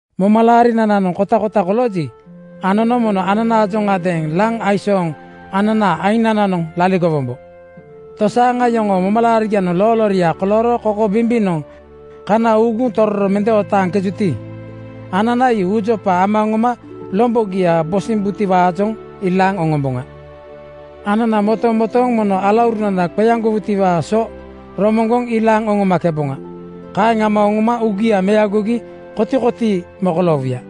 Momalaarinananoŋ kotakota kolooji, anono mono ananaajoŋadeeŋ laŋ aisooŋ ananaa ainananoŋ laligowombo. Tosaaŋa yoŋoo momalaarigianoŋ loolooria kolooro kokobimbinoŋ kana uuguŋ tororo mende otaaŋkejuti, anana ii uujopa ama oŋoma lombogia bosimbutiwaajoŋ ilaaŋ oŋomboŋa. Anana motomotooŋ mono alaurunananoŋ qeaŋgowutiwaa so romoŋgoŋ ilaaŋ oŋomakeboŋa. Kaeŋ ama oŋoma uugia meagogi kotikotii mokoloowuya.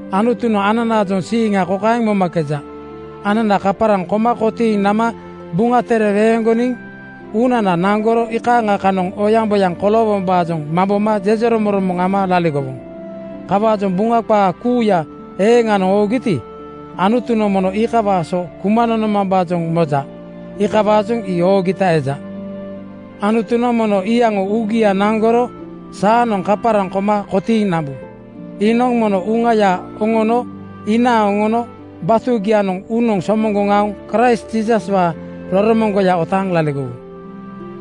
Anutunoŋ ananaajoŋ siiŋa kokaeŋ momakeja: Anana kaparaŋ koma kotiiŋ nama Buŋa Tere weeŋgoniŋ uunana naŋgoro iikaaŋa kanoŋ oyaŋboyaŋ koloowombaajoŋ mamboma jejeromoŋromoŋ ama laligowoŋ. Kawaajoŋ Buŋa qaa kuuya eeŋanoŋ oogiti, Anutunoŋ mono iikawaa so kuma nonomambaajoŋ moja. Iikawaajoŋ ii oogita eja. Anutunoŋ mono iyaŋo uugia naŋgoro saanoŋ kaparaŋ koma kotiiŋ nambu. Iinoŋ mono Uŋaya oŋono inaaŋ oŋono batugianoŋ uunoŋ somoŋgoŋ aoŋ Kraist Jiisaswaa roromoŋgoya otaaŋ laligowu.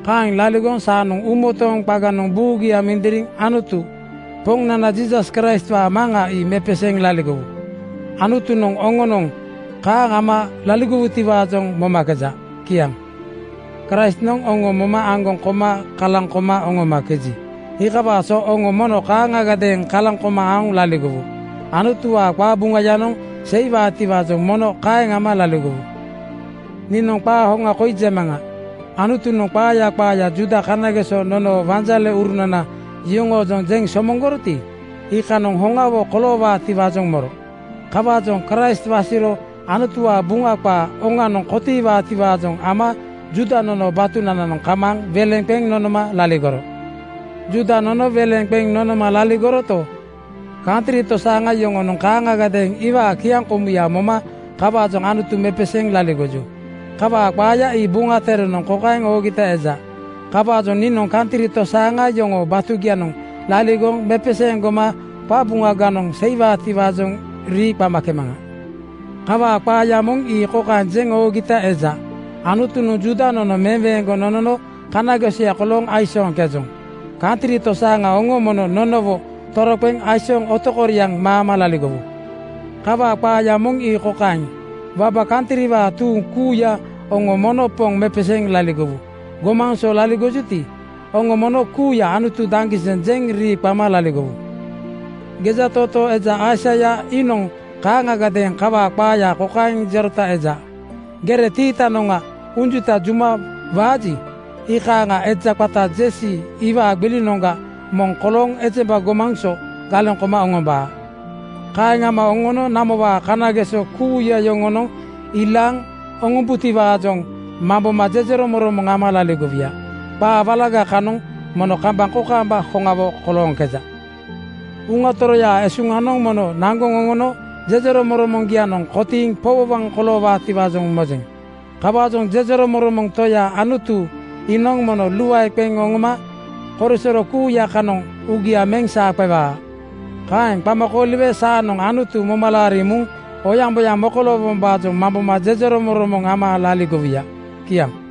Kaeŋ laligoŋ saanoŋ uumotooŋ qaganoŋ buugia mindiriŋ Anutu, Poŋnana Jiisas Kraistwaa Maŋa ii mepeseeŋ laligowu. Anutunoŋ oŋonoŋ kaaŋ ama laligowutiwaajoŋ momakeja. Kiaŋ. Kraistnoŋ oŋo moma aŋgoŋ koma kalaŋ koma oŋomakeji, iikawaa so oŋo mono kaaŋagadeeŋ kalaŋ koma aoŋ laligowu. Anutuwaa qabuŋayanoŋ seiwaatiwaajoŋ mono kaeŋ ama laligowu. Niinoŋ qaa hoŋa koi jemaŋa: Anutunoŋ qaaya qaaya Juuda kanageso nonoo wanjaleurunana yoŋoojoŋ jeŋ somoŋgoroti, iikanoŋ hoŋawo koloowaatiwaajoŋ moro. Kawaajoŋ Kraist wasiro Anutuwaa Buŋa qaa oŋanoŋ kotiiwaatiwaajoŋ ama Juuda nonoo batunananoŋ kamaaŋ weleŋ qeŋ nonoma laligoro. Juuda nono weleŋ qeŋ nonoma laligoroto, kantri tosaaŋa yoŋonoŋ kaaŋagadeeŋ iwaa kiaŋkomuya moma kawaajoŋ Anutu mepeseeŋ laligoju. Kawaa qaaya ii Buŋa Terenoŋ kokaeŋ oogita eja, “Kawaajoŋ niinoŋ kantri tosaaŋa yoŋoo batugianoŋ laligoŋ mepeseeŋ goma qabuŋaganoŋ seiwaatiwaa rii qamakemaŋa.” Kawaa qaaya moŋ ii kokaeŋ jeŋ oogita eja, “Anutunoŋ Juuda nono meweeŋgoŋ nonono kanagesoya kolooŋ aisooŋkejoŋ. Kantri tosaaŋa oŋo mono nonowo toroqeŋ aisooŋ otokoriaŋ maama laligowu.” Kawaa qaaya moŋ ii kokaeŋ, “Waba kantriwaa tuuŋ kuuya oŋo mono Poŋ mepeseeŋ laligowu. Gomaŋ so laligojuti, oŋo mono kuuya ‘Anutu daŋgiseŋ!’ jeŋ rii qama laligowu.” Gejatootoo eja Aisaia iinoŋ kaaŋagadeeŋ kawaa qaaya kokaeŋ jerota eja, “Gere tiitanoŋa unjuta juma waaji, iikaaŋa eja qata Jesi iwaa gbilinoŋa moŋ kolooŋ ejemba gomaŋ so galeŋ koma oŋombaa. Kaeŋ ama oŋono namowaa kanageso kuuya yoŋonoŋ ilaaŋ oŋombaatiwaajoŋ mamboma jejeromoŋromoŋ ama laligowuya.” Qaa walaga kanoŋ mono kambaŋ kokaamba hoŋawo kolooŋkeja. Uŋa Toroyaa esuŋanoŋ mono naŋgoŋ oŋono jejeromoŋromoŋgianoŋ kotiiŋ powowoŋ koloowaatiwaajoŋ mojeŋ. Kawaajoŋ jejeromoŋromoŋ Toya Anutu iinoŋ mono luae qeŋ oŋoma korisoro kuuya kanoŋ uugia meŋ saa qewaa. Kaeŋ qama kooliwe saanoŋ Anutu moma laariŋ muŋ oyaŋboyaŋ mokoloowombaajoŋ mamboma jejeromoŋromoŋ ama laligowuya. Kiaŋ.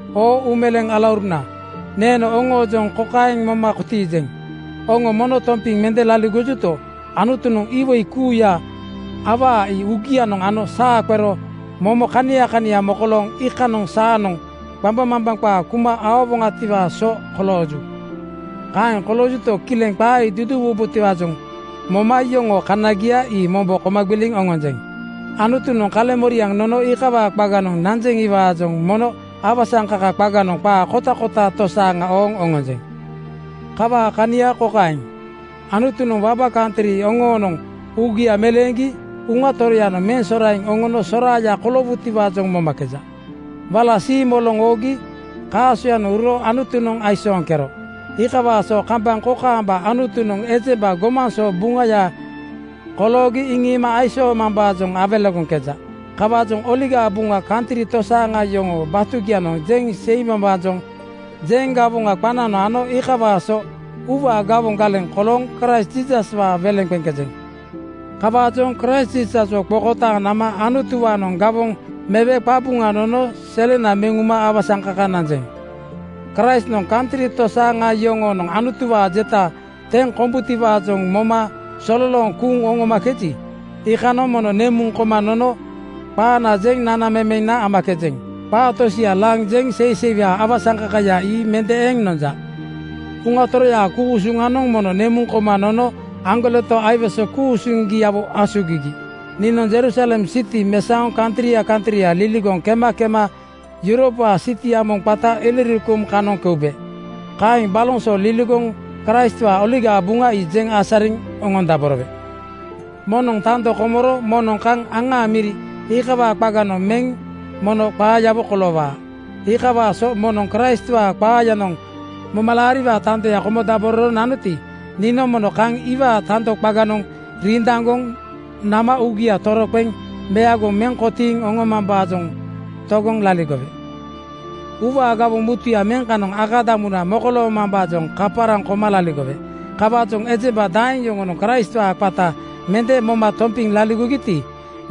Oo uumeleeŋ alauruna, neeno oŋoojoŋ kokaeŋ moma kotiijeŋ: Oŋo mono tompiŋ mende laligojuto, Anutunoŋ iwoi kuuya awaa ii uugianoŋ ano saa qero momo kania kania mokolooŋ iikanoŋ saanoŋ qambaŋmambaŋ qaa kuma aowoŋatiwaa so kolooju. Kaeŋ koloojuto, kileŋ qaa ii duduuwubotiwaajoŋ moma yoŋoo kanagia ii mombo koma gbiliŋ oŋonjeŋ. Anutunoŋ kaleŋmoriaŋ nono iikawaa qaganoŋ nanjeŋiwaajoŋ mono awasaŋkaka qaganoŋ qaa kotakota tosaaŋa ooŋ oŋonjeŋ. Kawaa kania kokaeŋ: Anutunoŋ waba kantri oŋonoŋ uugia meleeŋgi Uŋa Toroyanoŋ meŋ soraiŋ oŋono soraaya koloowutiwaajoŋ momakeja. Wala siimoloŋ oogi kaasoyanoŋ uro Anutunoŋ aisooŋkero, iikawaa so kambaŋ kokaamba Anutunoŋ ejemba gomaŋ so buŋaya koloogi iŋiima aisoomambaajoŋ awelegoŋkeja. Kawaajoŋ Oligaa Buŋaya kantri tosaaŋa yoŋoo batugianoŋ jeŋ seimambaajoŋ jeŋ gawoŋa qananoŋ ano iikawaa so uuwaa gawoŋ galeŋ kolooŋ Kraist Jiisaswaa weleŋ qeŋkejeŋ. Kawaajoŋ Kraist Jiisaswo qokotaaŋ nama Anutuwaanoŋ gawoŋ mewe qabuŋa nono selena meŋ uma awasaŋkaka nanjeŋ. Kraistnoŋ kantri tosaaŋa yoŋonoŋ Anutuwaa jeta teŋ kombutiwaajoŋ moma sololooŋ kuuŋ nomakeji, iikanoŋ mono nemuŋ koma nono qaana jeŋ nanamemena amakejeŋ. Qaa tosia laŋ jeŋ seiseiwaa awasaŋkakaya ii mende eŋ nonja. Uŋa Toroyaa ku-usuŋanoŋ mono nemuŋ koma nono aŋgoleto aiwese ku-usuŋgiawo asugigi. Niinoŋ Jerusalem siti mesaoŋ kantria kantria liligoŋ kema kema Yuropwaa sitia moŋ qata Ilirikum kanoŋ keube. Kaeŋ baloŋ so liligoŋ Kraistwaa Oligaa Buŋa ii jeŋ asariŋ oŋondaborowe. Moŋnoŋ tando komoro moŋnoŋ kaŋ aŋaa miria iikawaa qaganoŋ meŋ mono qaayawo koloowaa. Iikawaa so moŋnoŋ Kraistwaa qaayanoŋ momalaariwaa tando komodabororo nanoti, niinoŋ mono kaŋ iwaa tando qaganoŋ rindaŋgoŋ nama uugia toroqeŋ meagoŋ meŋ kotiiŋ oŋomambaajoŋ togoŋ laligowe. Uuwaa gawoŋ mutuya meŋ kanoŋ akadamuna mokoloomambaajoŋ kaparaŋ koma laligowe. Kawaajoŋ ejemba daeŋ yoŋonoŋ Kraistwaa qata mende moma tompiŋ laligogiti,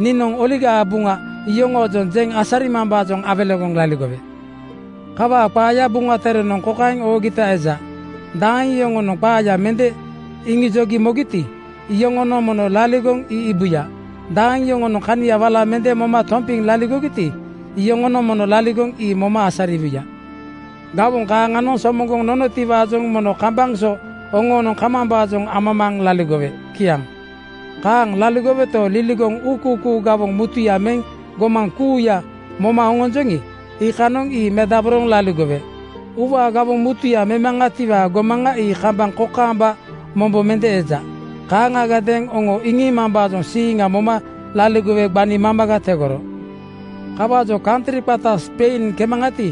niinoŋ Oligaa Buŋa iyoŋoojoŋ jeŋ asarimambaajoŋ awelegoŋ laligowe. Kawaa qaaya Buŋa Terenoŋ kokaeŋ oogita eja, “Daeŋ yoŋonoŋ qaaya mende iŋijogi mogiti, iyoŋonoŋ mono laligoŋ ii iibuya. Daeŋ yoŋonoŋ kania wala mende moma tompiŋ laligogiti, iyoŋonoŋ mono laligoŋ ii moma asariwuya.” Gawoŋ kaaŋanoŋ somoŋgoŋ nonotiwaajoŋ mono kambaŋ so oŋoonoŋ kamambaajoŋ amamaaŋ laligowe. Kiaŋ. Kaaŋ laligoweto, liligoŋ uukuukuu gawoŋ mutuya meŋ gomaŋ kuuya moma oŋonjoŋi, iikanoŋ ii medaboroŋ laligowe. Uuwaa gawoŋ mutuya memaŋatiwaa gomaŋa ii kambaŋ kokaamba mombo mende eja. Kaaŋagadeeŋ oŋo iŋiimambaa siiŋa moma laligowe gbani mamaga tegoro. Kawaajoŋ kantri qata Spein kemaŋati,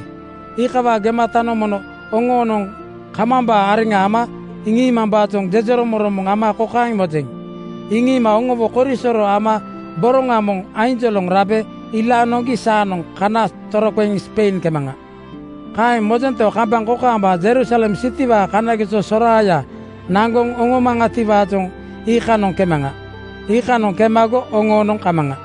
iikawaa gematanoŋ mono oŋoonoŋ kamambaa areŋa ama iŋiimambaajoŋ jejeromoŋromoŋ ama kokaeŋ mojeŋ: Iŋiima oŋowo korisoro ama boroŋa moŋ ainjoloŋ rabe ilaaŋ noŋgi saanoŋ kana toroqeŋ Spein kemaŋa. Kaeŋ mojento, kambaŋ kokaamba Jerusalem sitiwaa kanageso soraaya naŋgoŋ oŋomboŋatiwaajoŋ iikanoŋ kemaŋa. Iikanoŋ kemago oŋoonoŋ kamaŋa.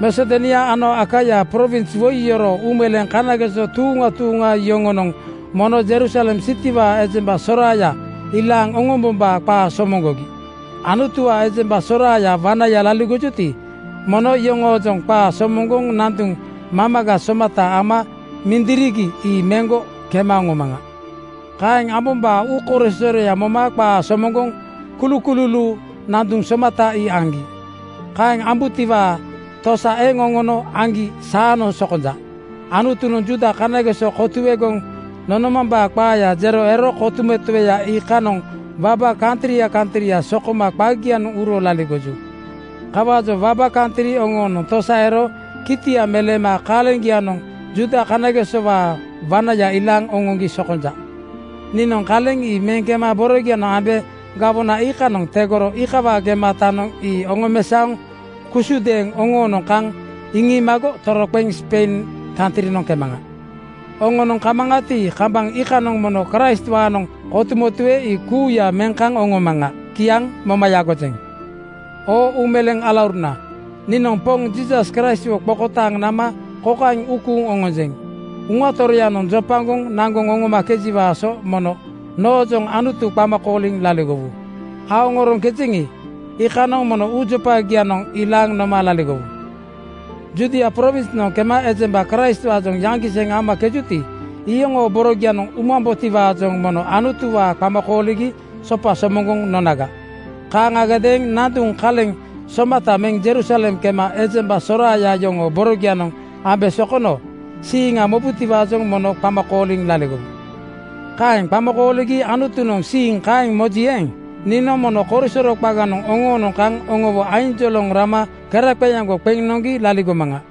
Masedonia ano Akaia prowins woi yoroo uumeleeŋ kanageso tuuŋa tuuŋa yoŋonoŋ mono Jerusalem sitiwaa ejemba soraaya ilaaŋ oŋombombaa qaa somoŋgogi. Anutuwaa ejemba soraaya wanaya laligojuti, mono iyoŋoojoŋ qaa somoŋgoŋ nanduŋ mamaga somata ama mindirigi ii meŋgo kema oŋomaŋa. Kaeŋ ambombaa uukorisoroya moma qaa somoŋgoŋ kulukululuu nanduŋ somata ii aŋgi. Kaeŋ ambutiwaa tosa eŋ oŋono aŋgi saanoŋ sokonja. Anutunoŋ Juuda kanageso kotuegoŋ nonomambaa qaaya jero ero kotumotue iikanoŋ waba kantria kantria sokoma qagianoŋ uro laligoju. Kawaajoŋ waba kantri oŋoonoŋ tosa ero kitia meleema kaleŋgianoŋ Juuda kanagesowaa wanaya ilaaŋ oŋoŋgi sokonja. Niinoŋ kaleŋ ii meŋ kema borogianoŋ ambe gawona iikanoŋ tegoro iikawaa gematanoŋ ii oŋomesaoŋ kusudeeŋ oŋoonoŋ kaŋ iŋiimago toroqeŋ Spein kantrinoŋ kemaŋa. Oŋoonoŋ kamaŋati, kambaŋ iikanoŋ mono Kraistwaanoŋ kotumotue ii kuuya meŋ kaŋ oŋomaŋa. Kiaŋ moma yagojeŋ. Oo uumeleeŋ alauruna, niinoŋ Poŋ Jiisas Kraistwo qokotaaŋ nama kokaeŋ uu kuuŋ oŋonjeŋ: Uŋa Toroyanoŋ jopagoŋ naŋgoŋ oŋomakejiwaa so mono noojoŋ Anutu qama kooliŋ laligowu. Aoŋoroŋkejeŋi, iikanoŋ mono uujopagianoŋ ilaaŋ noma laligowu. Judia prowinsnoŋ kema ejemba Kraistwaajoŋ yaŋgiseŋ amakejuti, iyoŋoo borogianoŋ umambotiwaajoŋ mono Anutuwaa qama kooligi sopa somoŋgoŋ nonaga. Kaaŋagadeeŋ nanduŋ kaleŋ somata meŋ Jerusalem kema ejemba soraaya yoŋoo borogianoŋ ambe sokono siiŋa mobutiwaajoŋ mono qama kooliŋ laligowu. Kaeŋ qama kooligi Anutunoŋ siiŋ kaeŋ moji eeŋ, niinoŋ mono korisoro qaganoŋ oŋoonoŋ kaŋ oŋowo ainjoloŋ rama keraqeeaŋgo qeŋ noŋgi laligomaŋa.